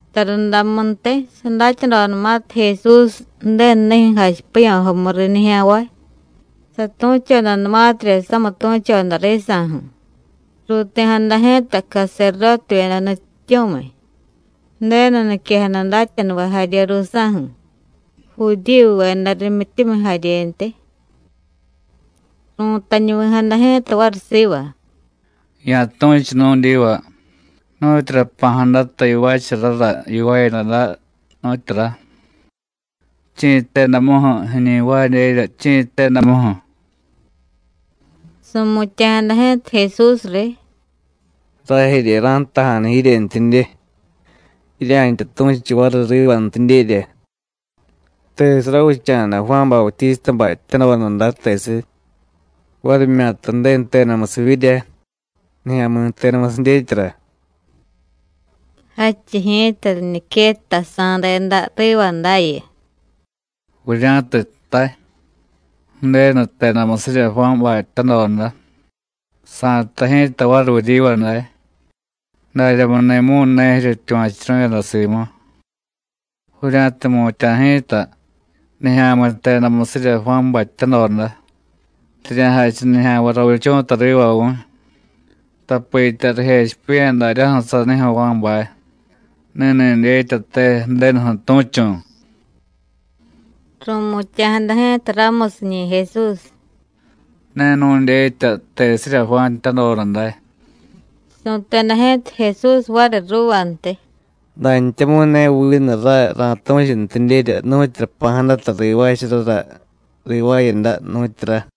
Tarundamuntiy, sadatyadodanumatiy Jesús Ju̱denunijyu̱ jachipiya̱jomu riy nijya̱nvay, satu̱chodanumatirya samitu̱choda risa̱ju̱, ruuti̱jada ji̱ta caserdótevyeda nutyityu̱miy, Ju̱denu niquejada datyanuvay jarye ruusa̱ju̱, Judíyuveda rimyityumiy jaryentiy. Ru̱tañuvi̱jada ji̱ta variy siva: “Ya̱tu̱chu nu̱dyiva, ¿nu̱tyura jpa̱jadata yivaacharara yivaayada day, nu̱tyura? ¿chi̱ jtedamuju̱ jiiñi jvaadyerya, chi̱ jtedamuju̱?” Su̱mutya̱jada ji̱ta Jesús riy: “Rajerye ra̱jtaja̱nu jiryentyidye, jirya̱ntya tu̱chu variy rivantidyerya: ¿Tesiy ravicha̱da Juán Bautístabay jtyadoda day, tesiy? ¿varimyata Ju̱denu jtedamusivyirya, nijya̱mi̱ jtedamusiy dyetyara?” Jadchiy ji̱ta riñiquettasa̱deda riva dayu: “Vurya̱tiy jtay: Ju̱denu jtedamusirya Juánbay jtyadoda, sa̱jtay ji̱ta variy vuryiva day: ¿Daryamuni̱mu̱y ne jiryetyuva̱churu̱yada simu? Vurya̱tiy jmutya̱ ji̱ta: Nijya̱mi̱ jtedamusirya Juánbay jtyadoda, rirya̱jachiy nijya̱nvay ravichu̱ta riva vu̱y, tapitya rijechipiya̱ daryaju̱ sanijyu̱ Juánbay: Ni̱ni̱ dyetyate Ju̱denuju̱ tu̱chu̱.” Ru̱mutya̱jada ji̱ta ramusiñi̱ Jesús: “Ne nu̱dyetya tesirya Juán jtyadoda day.” Su̱teda ji̱ta Jesús variy ruuvantiy: “Dantyamu̱y ne vinu ray ra̱tu̱chuntidyerya nu̱tyura jpa̱jadata rivaacharara rivaayada, nu̱tyura.”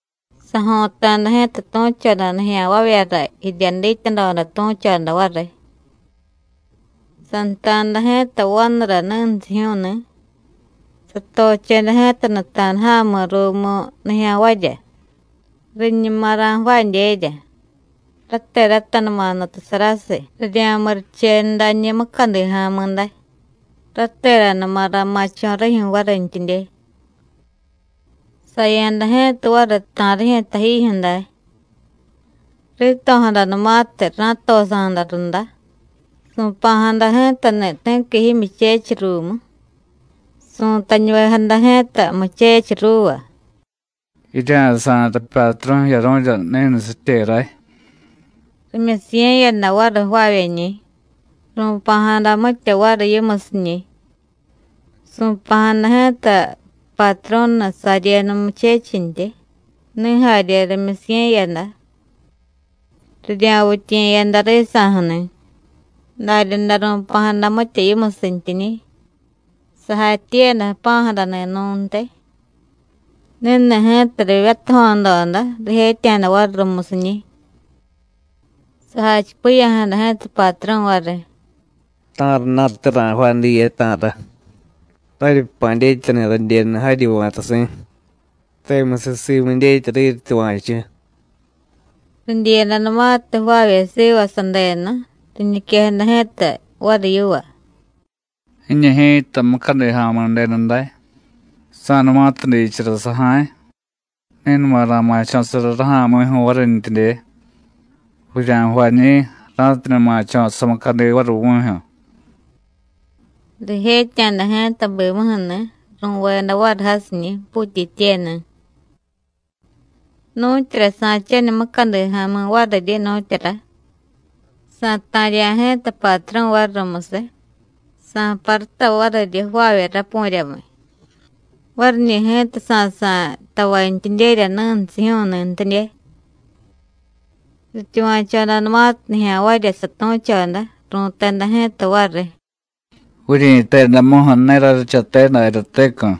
Sajo̱ta̱da ji̱ta tu̱choda nijya̱nvavyara jirya dityadoda tu̱choda variy: “Santa̱da ji̱ta vanura ni̱nsijyu̱u̱ni̱. Satocheda ji̱ta nuta̱da ja̱mi̱ ruumu nijya̱nvarya, riñuma ra̱jvaadyerya, rateratanuma nutasarasiy rirya̱murichenu dañi̱ mucadi ja̱mi̱ day, rateranuma ra̱ma̱cho̱ rijyu̱ varintyidye. Saya̱da ji̱ta variy ta̱rijyu̱ tajijyu̱ day. Rito̱jadanumatiy ra̱tosa̱da runda, su̱pa̱jada ji̱tani̱ ti̱qui jimyuchechiy ruumu. Su̱tañuvejada ji̱ta muchechiy ruuva: ‘Jirya̱sa̱y rapyatru̱ jiyaru̱rya ni̱nusitye ray.’ Rimyusiye̱yada variy jvaavyeñi̱, ru̱pa̱jada mitya variy yimusiñi̱. Su̱pa̱jada ji̱ta patru̱ni̱ saryenu muchechintyi, ni̱ jarye rimyusiye̱yada, rirya̱vityiye̱yada risa̱ju̱ni̱, daryaday ru̱pa̱jada mitya yimusintiñi̱. Sajatyiiyada jpa̱jadani̱ nu̱ntiy. Ni̱ni̱ ji̱ta rivyatajo̱doda, rijetya̱da variy rumusiñi̱. Sajachipiya̱jada ji̱ta patru̱ variy: ¿Ta̱rana̱te ra̱jvaay diye, ta̱ra? Raryi jpa̱ dyetyani̱ radyenu jaryi va̱tasi̱; temusiy simu dyetya riryityuva̱chu. Ridyiyadanumatiy jvaavye siva sadenu, riñiquejada ji̱ta variy yiva: Jiñu ji̱ta mucadi ja̱mi̱ denu day. Sa̱numatiy diichara saja̱y, ni̱numa ra̱ma̱cho̱sara raja̱mi̱ju̱ varintyidye. Vurya̱jvañi̱, ra̱tidye ma̱cho̱ samucadi variy vu̱jyu̱. Rijetya̱da ji̱ta bimuju̱ni̱, ru̱veda variy jasiñi̱, puutyityeni̱. ¿Nu̱tyura sa̱chaniy mucadi ja̱mi̱ variryi, nu̱tyura? Sa̱ta̱rya̱ ji̱ta patru̱ variy rumusiy, sa̱paruta variryi jvaavye rapu̱ryamiy. Variñi̱ ji̱ta sa̱sa̱y tavantyidyerya ni̱nsijyu̱u̱ni̱ntidye.” Rityuva̱chodanumatiy nijya̱nvarya satu̱choda, ru̱teda ji̱ta variy: “¡Vuryi̱tedamuju̱ ne ráryichate daryatecu̱!”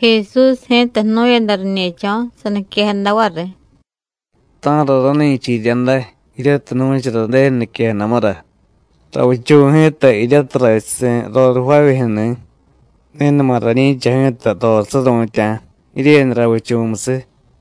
Jesús ji̱ta jnu̱yada riñe̱cho̱, saniquejada variy: “¿Ta̱ra rani̱cha jirya day, jiryatiy nu̱chara Ju̱denu niquejadamura: Ravichu̱ ji̱ta jiryatiy rrachusi̱ roriy jvaavyejyu̱ni̱, ni̱numa rañi̱cha ji̱ta roriy suru̱tya̱, jiryenu ravichu̱musiy?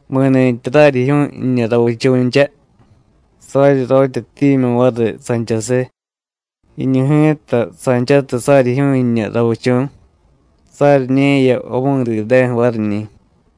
Mi̱ni̱tyi raryijyu̱u̱y jiñu ravichu̱ncha, saryiryotyatimyu̱y variy sanchasiy; jiñu ji̱ta, sanchatiy saryijyu̱u̱y jiñu ravichu̱, saryiñe̱ya vamidideju̱ variñi̱.”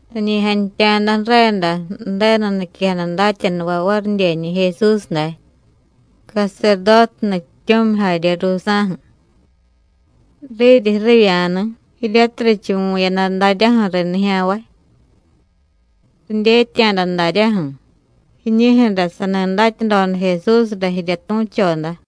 Riñi jantya̱da ju̱reda Ju̱denu niquejada datyanuvay varidyeñi̱ Jesús day, caserdóte nutyityu̱miy jarye ruusa̱ju̱, riryi ju̱rivya̱ni̱, jiryatiy richuvu̱yada daryaju̱ riy nijya̱nvay. Ridyetya̱da daryaju̱: jiñijyu̱ra sani datyadoda Jesúsra jirya tu̱choda.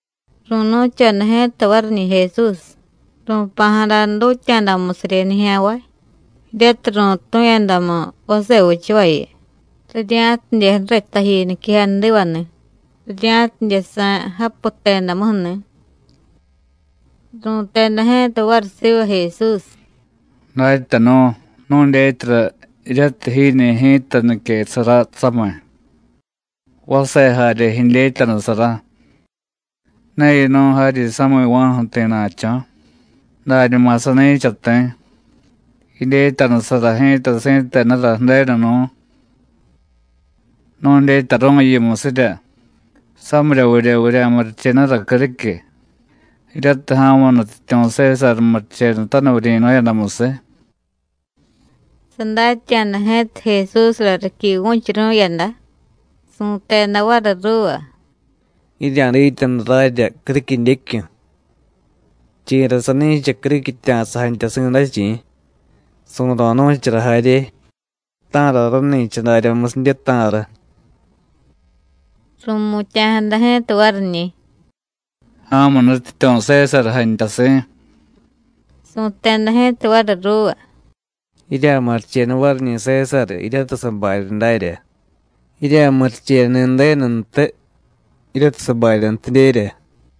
Ru̱nu̱choda ji̱ta variñi̱ Jesús, ru̱pa̱jada dutya̱damusiryi nijya̱nvay, jiryatiy ru̱tu̱yadamu vase vichavayu, rirya̱tidye ju̱riy taji niquejadivani̱, rirya̱tidye sa̱y japu jtedamuju̱ni̱. Ru̱teda ji̱ta variy siva Jesús: “Datyanu̱, nu̱dyetyara jiryatiy jiiñi̱ ji̱ta niquesara samiy, vase jarye jidyetyanusara. Ne yinu̱y jaryi sami̱va̱ju̱ ti̱na̱cho̱, dañuma sani̱cha ti̱. Jidyetyanusara ji̱ta si̱tenura Ju̱denu nú̱. Nu̱dyetyaru̱y yimusirya: ¿Samiryavidye vurya̱murichenura criquiy, jiryatiy ja̱mu nutyityu̱ Sésar murichenutaniy vuryi̱nu̱yadamusiy?” Sadatya̱da ji̱ta Jesúsra riquivu̱churu̱yada, su̱teda variy ruuva: “Jirya̱dityanu rarya criquidyecyu̱. ¿Chi̱ra sani̱cha criquitya̱sa jantyasi̱ day, chi̱? su̱ro̱ nu̱chara jarye, ¿ta̱ra rani̱cha daryamusidye, ta̱ra?” Ru̱mutya̱jada ji̱ta variñi̱: “Ja̱mu nutyityu̱ Sésar jantyasi̱.” Su̱teda ji̱ta variy ruuva: “Jirya̱murichenu variñi̱ Sésar jiryatiy sabarya darya, jirya̱murichenuni̱ Ju̱denuntiy jiryatiy sabaryantidyerya.”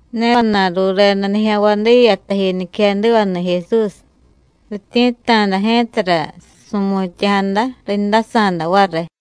Ne vana̱y rureda nijya̱nvay diya taji niquejadivani̱ Jesús. Rityi̱tta̱da ji̱tara su̱mutya̱jada, rindasa̱da variy.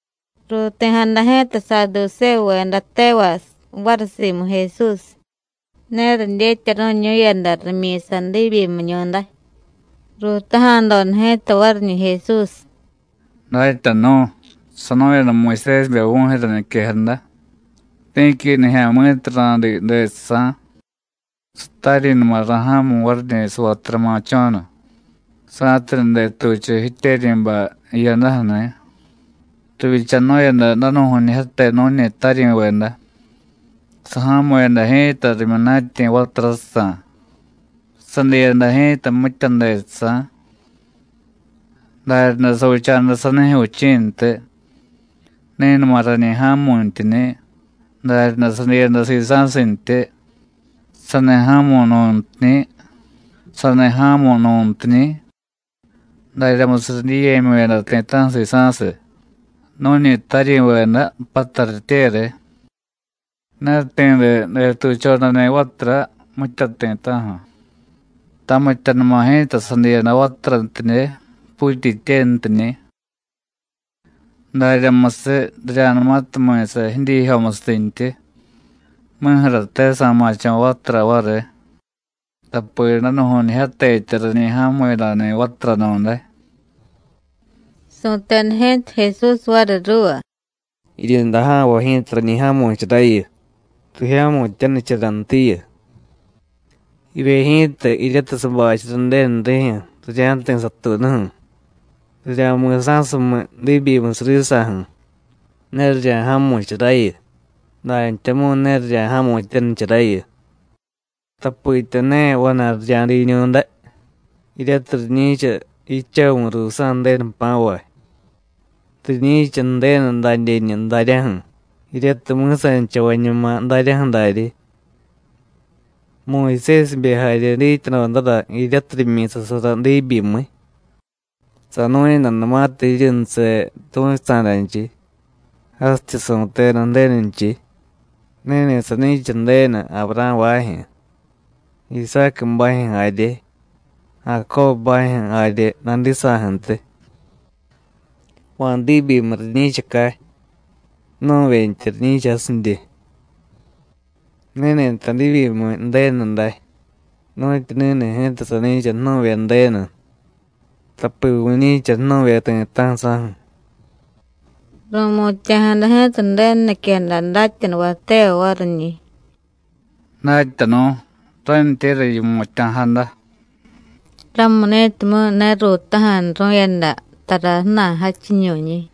Ruuti̱jada ji̱ta Saadusévuveda tevay variy simu Jesús. Ne ridyetyaru̱ñu̱yada rimyi̱sa diibyimiñu̱day. Ruutaja̱doda ji̱ta variñi̱ Jesús: “Datyanu̱, sanu̱yada Muyusésibe vu̱jyu̱ra niquejada: Ti̱qui nijya̱mi̱tiy ra̱diiy dejsa̱, sataryi̱numa ra̱ja̱mu̱y variñi̱ savatura ma̱cho̱nu, sa̱tidye detuchu jityeryi̱bay jiyadaju̱ni̱. Rivyichanu̱yada danu̱ju̱ñijyate nu̱ñi taryi̱veda. Saja̱mu̱yada ji̱ta rimyunatyi̱ vaturajsa̱, sadiiyada ji̱ta mitya dejsa̱. Daryaday savicha̱da sanijyu̱ vichi̱ntiy. Ni̱numa rañi ja̱mu̱ntyiñi̱, daryaday sadiiyada sisa̱sintyi. Sani ja̱mu̱y nu̱ntiñi̱, sani ja̱mu̱y nu̱ntiñi̱, daryamusiy ridyiiye̱myu̱yada ti̱ta̱ju̱ sisa̱siy nu̱ñi taryi̱veda, pattaryitye riy. Ne ti̱de detuchodani̱ vatura, mitya ti̱ta̱ju̱. Tamityanuma ji̱ta sadiiyada vaturantidye, puutyityentiñi̱. Daryamusiy, rirya̱numatiy mi̱sa jidyiijyomusintyi, mi̱ju̱rate sa̱ma̱cho̱ vatura variy, tapi danu̱ju̱ñijyatetya rañi ja̱mu̱yadani̱ vaturanu̱day.” Su̱teda ji̱ta Jesús variy ruuva: “Jiryunda ja̱nvay ji̱ta rañi ja̱mu̱charayu, rijya̱mu̱tyanicharantiyu. Jivye ji̱ta jiryatiy sabachara Ju̱denu rijyu̱ rirya̱jti̱ satuunuju̱, rirya̱mi̱sa̱sumiy diibyimusiy risa̱ju̱, ne rirya̱ja̱mu̱charayu, dantyamu̱y ne rirya̱ja̱mu̱tyanicharayu, tapitya ne vana̱y rirya̱diiñu̱day, jiryatiy riñi̱cha jidchavu̱ ruusa̱ Ju̱denu jpa̱vay. Riñi̱cha Ju̱denu dadyeñu daryaju̱, jiryatiy mi̱sanichavañuma daryaju̱ daryi. Muyusésibe jarye dityadodara jiryatiy rimyi̱sasara diibyimiy, sanu̱yadanumatiy jiryunuse tu̱chusa̱danchiy, jasityi su̱teda Ju̱denunchiy: Ni̱ni̱ sani̱cha Ju̱denu Avurá̱bajyu̱, Isácubajyu̱ jarye, Jacóbubajyu̱ jarye nadisa̱ju̱ntiy. Va̱ diibyimiy riñi̱chacay, jnu̱vyentya riñi̱cha jasidye. Ni̱ni̱ta diibyimiy Ju̱denu day, nu̱tyu ni̱ni̱ ji̱ta sani̱cha jnu̱vye Ju̱denu, tapi vu̱ñi̱cha jnu̱vye ti̱ta̱ju̱ sáju̱.” Ru̱mutya̱jada ji̱ta Ju̱denu niquejada datyanuvay tevay variñi̱: “¡Datyanu̱, rántyéra yimutya̱jada!” Ramuni̱timyu̱ ne ruutaja̱nuru̱yada tara ju̱na̱y jadchiñu̱nñi̱.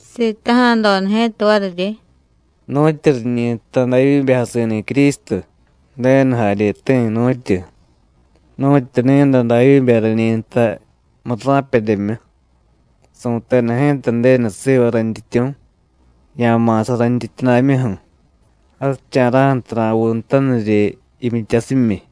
Sitaja̱doda ji̱ta variryi: “¿Nu̱tyu riñi jtay Davyíbe jasi̱ni̱ Crístu, Ju̱denu jaryeti̱, nu̱tyu? Nu̱tyu ni̱day Davyíbe rañi jtay murra̱pedyemyu: Su̱teda ji̱ta Ju̱denu siva rayntyityu̱: Ya̱ma̱sa rayntyityudamyuju̱, jasicha̱ra̱ju̱tiy ra̱vuunutaniryi jimyityasimyi.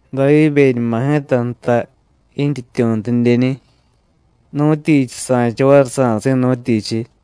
Davyíbeñuma ji̱ta jtay jintyityu̱ntidyeñi̱, ¿nu̱tyichiy sa̱cha variy sa̱si̱, nu̱tyichiy?”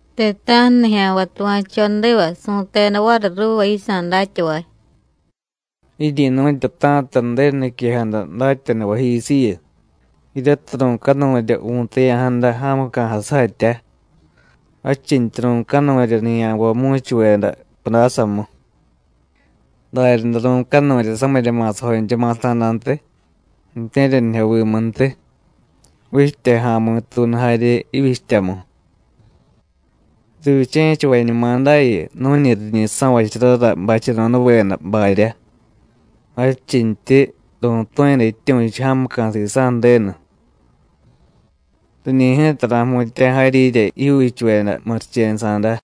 Ti̱ta̱ju̱ nijya̱nvay tuva̱chodiva su̱teda variy ruuva yisa̱ datyavay: “Jiryi̱nu̱tyata̱ta Ju̱denu niquejada datyanuvayjisiyu, jiryatiy ru̱canurya vu̱taya̱jada ja̱muca̱jay sujatya, jadchintyi ru̱canurya nijya̱nvay mu̱chuveda pudásamu. Daryaday ru̱canurya samirya ma̱sajoncha ma̱sa̱dantiy, ju̱tye̱ryanijyovimuntiy, vichtya ja̱mi̱tuunu jarye jivyichtyamu. Rivyiche̱chavañumadayu nu̱ñi riñi so̱vacharara bacheno̱daveda barya, jadchintyi ru̱tu̱yada jityu̱chu jamuca̱ sisa̱ Ju̱denu. Riñi̱ ji̱ta ra̱jmutya̱ jaryirya jijyuuchuveda murichenusa̱da.”